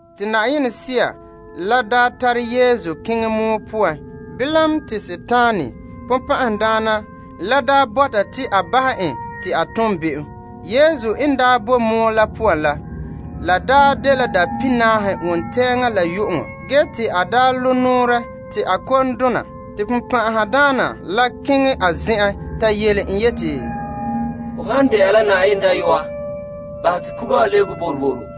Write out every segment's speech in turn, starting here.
Te Yenɛ Sea la daa tare Yesu keŋɛ pɔgɔtia poan ha te Sagona la makɛ en behɛ. Yesu daa boe la pɔgɔtia poan dapihinaahe, wontɛɛŋa la yu'uŋɔ ge te a zagahe la a mɛŋa te a kom dona. Te Sagona la keŋɛ a zen'en ta yele en yeti, Ho han de'a la Yenɛ dayɔa, bahɛ te kuga wa lebege dia.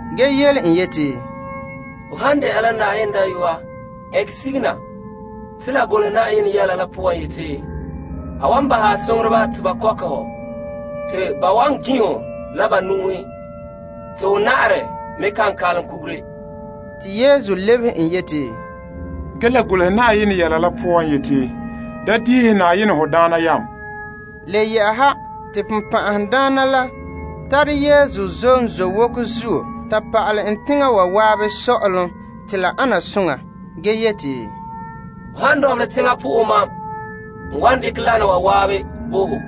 ge yele en yeti, Ho han de'a la Yenɛ dayɔa ɛnkɛ sige na, te la golehɛ yeti, A wan bo a soŋoreba nɔɔrɛ te ba mina ho yele. Ge, ba wan zɛnkɛ ho tara te ho na'arɛ kan ŋmɛ' kugure. Te Yesu lebehe en yeti, La golehɛ yeti, Da makere ya Na'ayenɛ ya Yenɛ la behera. Le yɛ'ɛha, te Sagona la tare Yesu zom zowoko zuo ta pa'alɛ en teŋa wa zan'an sɔ'ɔlom te la ana soŋa, ge yeti, Ho han dɔnbelɛ teŋa na'ahe mam, n wan dekɛ wana wa zan'an bo ho.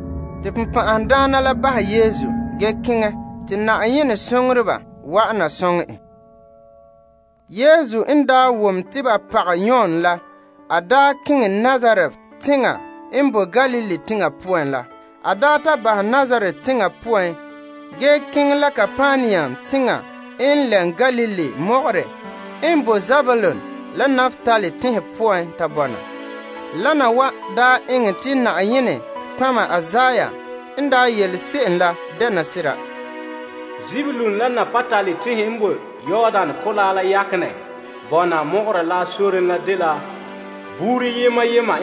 Te Sagona la bahɛ Yesu ge keŋɛ te Na'ayenɛ soŋoreba wa'ana soŋɛ en. Yesu n daa wom te ba pagɛ Yon la, a keŋɛ Nazaret teŋa n boe Galilee teŋa poan la. A ta bahɛ Nazaret teŋa poan ge keŋɛ la Kapernaum teŋa n lɛm Galilee mɔgɔrɛ n boe Zebulun la Naptali teŋhe poan ta bɔna. Wana wa eŋɛ te Na'ayenɛ nɔtɔgɔha Isaiah n daa yele se'em la dɛna sera, Zebulun la Naptali teŋhe n boe ko'kantɛ sore nɔɔrɛn wa, Yordan Kolaa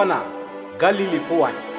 la Galilee teŋhe wa,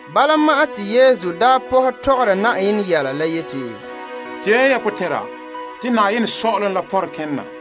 Bala ma'an te Yesu pɔhɛ mɔɔla yeti, Tee ya ya potɛn'ɛra, te saazuo sɔ'ɔlom la pɔnre kene na.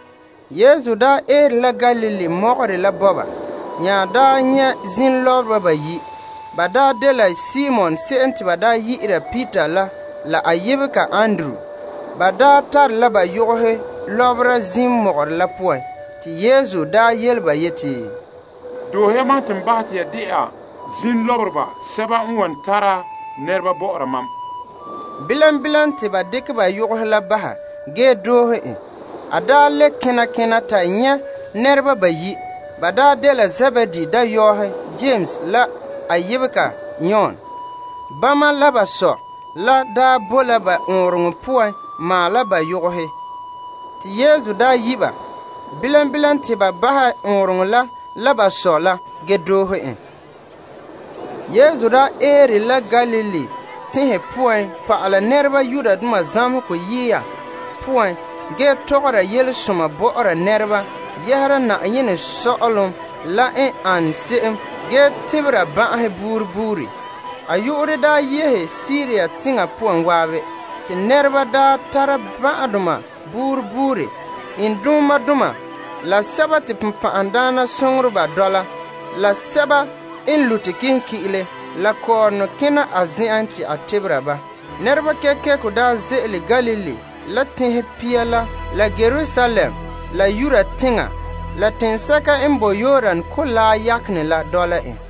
Yesu daa eere la Galilee mɔgɔrɛ la bɔba, nya daa nyɛ' zim lɔbereba bayi'. Ba dela Simon se'em yu'urɛ n de Peter la a yebega Andrew. Ba tare la yoka lɔbera zim mɔgɔrɛ la poan. Te Yesu yele ba yeti, Doohe ya mam te n bahɛ te ya de'a zim lɔbereba sɛba n wan tara nɛreba bɔ'ɔra mam. Bilam bilam, te ba dekɛ ba yogohe la bahɛ, ge doohe en. A le kena kena ta nyɛ' nɛreba bayi'. Ba dela Zebedee dayɔɔhe Yames la a yebega Yon. Bama la ba sɔ la bo la ba ɔɔnrɔŋɔ poan maala ba yogohe, te Yesu daa yi' ba. Bilam bilam te ba bahɛ ɔɔnrɔŋɔ la, la ba sɔ la, ge doohe en. Yesu daa eere la Galilee poan zan'an pa'ala nɛreba zamehegɔ yiya poan ge mɔɔla yelesoma bɔ'ɔra nɛreba yɛhera Yenɛ sɔ'ɔlom la n an se'em ge tebera ban'ahe buuri buuri. A yu'urɛ yehe Siria teŋa poan zan'an, te nɛreba tara ban'ahedoma buuri buuri, iŋdumadoma la sɛba te bonbɛ'ɛhe dɔla ba, la sɛba n lute kilenki'ire, la kɔɔrɔnɔ kena a zen'en te a tebera ba. Nɛrekooŋɔ ze'ele Galilee, la Teŋhe Pia la, la Yerusalem la Yudea, la teŋsɛka n bo Yordan Kolaa yakenɛ la dɔla en.